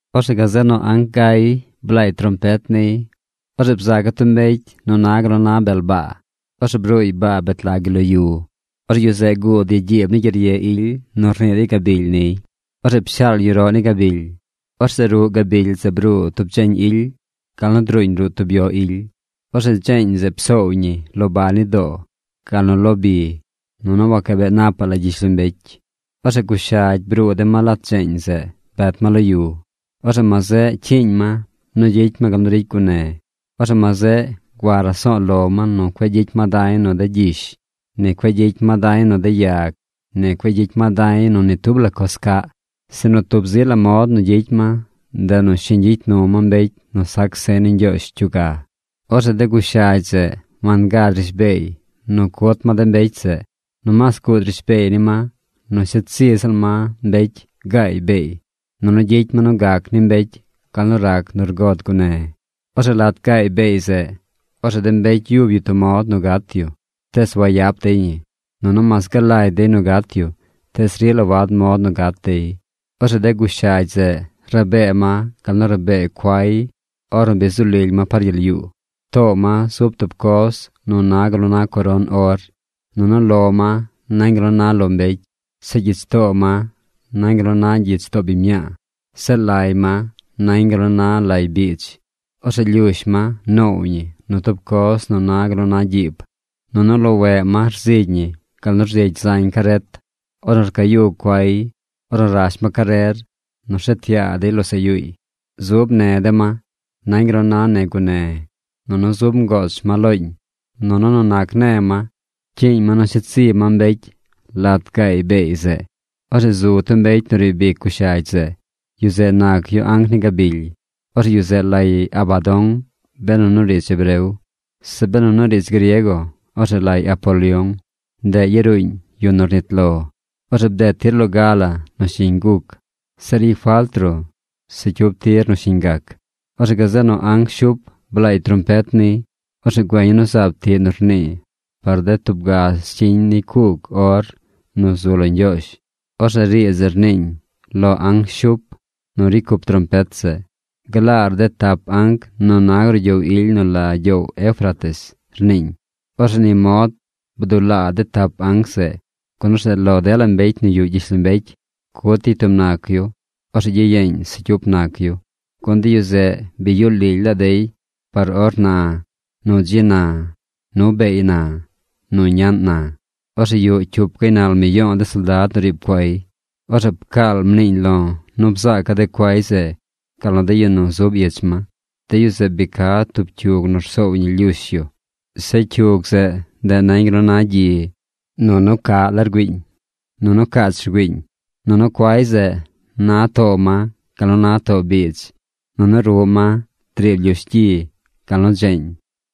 Orzeꞌ gazeꞌ nu anc gay blaay trompet niy. Orzeꞌ bzaaca̱ tub mbecy nu na gal nu na bel baa. Orzeꞌ bruuy baa bet lag yu lo yu. Orzeꞌ yu zeꞌ guud ya gyiib ni gyerye ily nu rnii dey gabily niy. Orzeꞌ pshaal yu roꞌ ni gabily. Orzeꞌ ruꞌ gabily zeꞌ bruu tub dzeeñ ily gal nu druuñ ruꞌ tub yo ily. Orzeꞌ dzeeñ zeꞌ psoow ñi lo ba ni doo, gal nu lo bi, nunu wacabee napaꞌ la gyishlombecy. Orzeꞌ gushagy bruu de ma lat dzeeñ zeꞌ bet ma lo yu. Orzeꞌ ma zeꞌ cyiiñ ma nu gyicy ma gal nu ricy gune. Orzeꞌ ma zeꞌ gua raso̱o̱ lo ma nu cueꞌ gyicy ma da̱y nu de gyish, ni cueꞌ gyicy ma da̱y nu de yag, ni cueꞌ gyicy ma da̱y nu ni tub la coz caꞌ. Sinu tub zi la mod nu gyicy ma, ndeꞌ nu shiñ gyicy nu ma mbecy nu sac sey ni Ñgyoozh cyuga. Orzeꞌ de gushagy zeꞌ wangad rishbeey nu cut ma de mbecy zeꞌ. Nomaas guud rishbeey ni ma nu shet zi ziꞌl ma mbecy gaay beey. Nunu gyicy ma nu gac ni mbecy gal nu rac nu rgod gune. Orzeꞌ lat gaay beey zeꞌ, orzeꞌ de mbecy yub yu tub mod nu gat yu. Tees wayap dey ñi. Nunu mas galagy dey nu gat yu, tees rila wad mod nu gat dey. Orzeꞌ de gushagy zeꞌ rabee ma gal nu rabee cuay ornu bi zu lily ma par gyel yuu. Too ma zub tub coz nu na gal nu na coron or. Nunu lo ma nañ gal nu na lo mbecy. Zeꞌ gyich too ma nañ gal nu na gyich too biñ mñaa. Zeꞌ lay ma nañ gal nu na lay biidz. Orzeꞌ lyush ma noow ñi nu tub coz nu na gal nu na gyiib. Nunu loweꞌ ma rzigy ñi gal nu rzigy zañ caret ornu rca yu cuay ornu rash ma carer nu rshet yaa dey losaꞌ yuuy. Zub ne de ma. Nañ gal nu na ne gune. Nunu zub ngooch ma looñ. Nunu nu nac ne ma, cyiiñ ma nu shet zi ma mbecy lat gaay beey zeꞌ. Orzeꞌ zu tub mbecy nu riib ic gushagy zeꞌ. Yu zeꞌ nac yu anc ni gabily. Orzeꞌ yu zeꞌ lay Abadón benu nu riidz hebreo. Zeꞌ benu nu riidz griego, orzeꞌ lay Apolión. Ndeꞌ yaruuñ yu nu rnit lo. Orzeꞌ bded tir loga la nu shiñ guc. Zeꞌ ricy falt ruꞌ se cyup tir nu shiñ gac. Orzeꞌ gazeꞌ nu anc shup blaay trompet niy. Orzeꞌ güeña̱ nu zaab tiꞌ nu rnii par de tub ga scyiñ ni cuug or nu zu lo Ñgyoozh. Orzeꞌ riidz zeꞌ rniiñ lo anc shup nu ricy cup trompet zeꞌ: ―Glaar de tap anc nu nag ruꞌ gyoow ily nu la gyoow Eufrates ―rniiñ. Orzeꞌ ni mod bdulaa de tap anc zeꞌ, gun orzeꞌ lo dela mbecy nu yuꞌ gyishlombecy, cut dey tub nac yu. Orzeꞌ gyiyeeñ se cyup nac yu. Gun de yu zeꞌ bi yuꞌ lily laa dey par or na, nu dzi na, nu beey na, nu ñaꞌn na. Orzeꞌ yuꞌ cyup gaynal miyo̱o̱ de soldad nu riib cuay. Orzeꞌ pcaal mniiñ lo̱ nu bzaaca̱ de cuay zeꞌ gal nu de yu nu zub ich ma. De yu zeꞌ bi ca tub cyug nu rsoow ñi lyush yu. Zeꞌ cyug zeꞌ, ndeꞌ nañ gal nu na gyi, nunu caꞌ la rgüiiñ, nunu caach rgüiiñ. Nunu cuay zeꞌ na too ma gal nu na too biidz. Nunu ruꞌ ma driib lyush gyi, gal nu dzeeñ,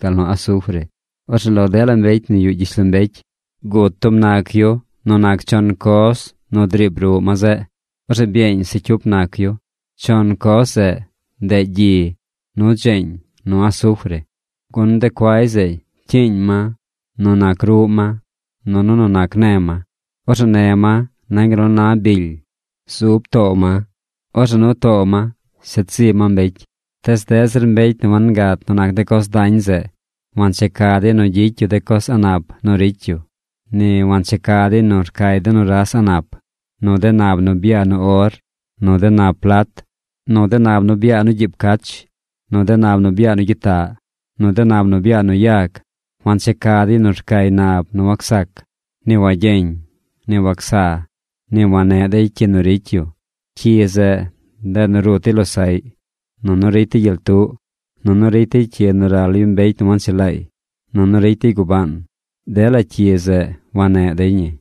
gal nu asufre. Orzeꞌ lo dela mbecy nu yuꞌ gyishlombecy, gut tub nac yu nu nac chon coz nu driib ruꞌ ma zeꞌ. Orzeꞌ byeeñ se cyup nac yu. Chon coz zeꞌ, ndeꞌ gyi, nu dzeeñ, nu asufre. Gun de cuay zeꞌ cyiiñ ma nu nac ruꞌ ma nunu nu nac ne ma. Orzeꞌ ne ma nañ gal na bily. Zub too ma. Orzeꞌ nu too ma shet zi ma mbecy. Tees deꞌ zir mbecy nu wangat nu nac de coz dañ zeꞌ wancheca dey nu gyicy yu de coz a̱ꞌ nap nu ricy yu, ni wancheca dey nu rcay de nuras a̱ꞌ nap, nu de nab nu byaa nu or, nu de nab plat, nu de nab nu byaa nu gyiib cach, nu de nab nu byaa nu gyitaꞌ, nu de nab nu byaa nu yag. Wancheca dey nu rcay nab nu wacsac, ni wagyeñ, ni wacsa. Ni wanneꞌ dey cyi nu ricy yu. Cyi zeꞌ, ndeꞌ nu rut dey losaꞌy, nunu ricy dey gyel tuꞌ, nunu ricy dey cyi nu ral yu mbecy nu wanchelaay, nunu ricy dey gubaan. Dela cyi zeꞌ wanneꞌ dey ñi.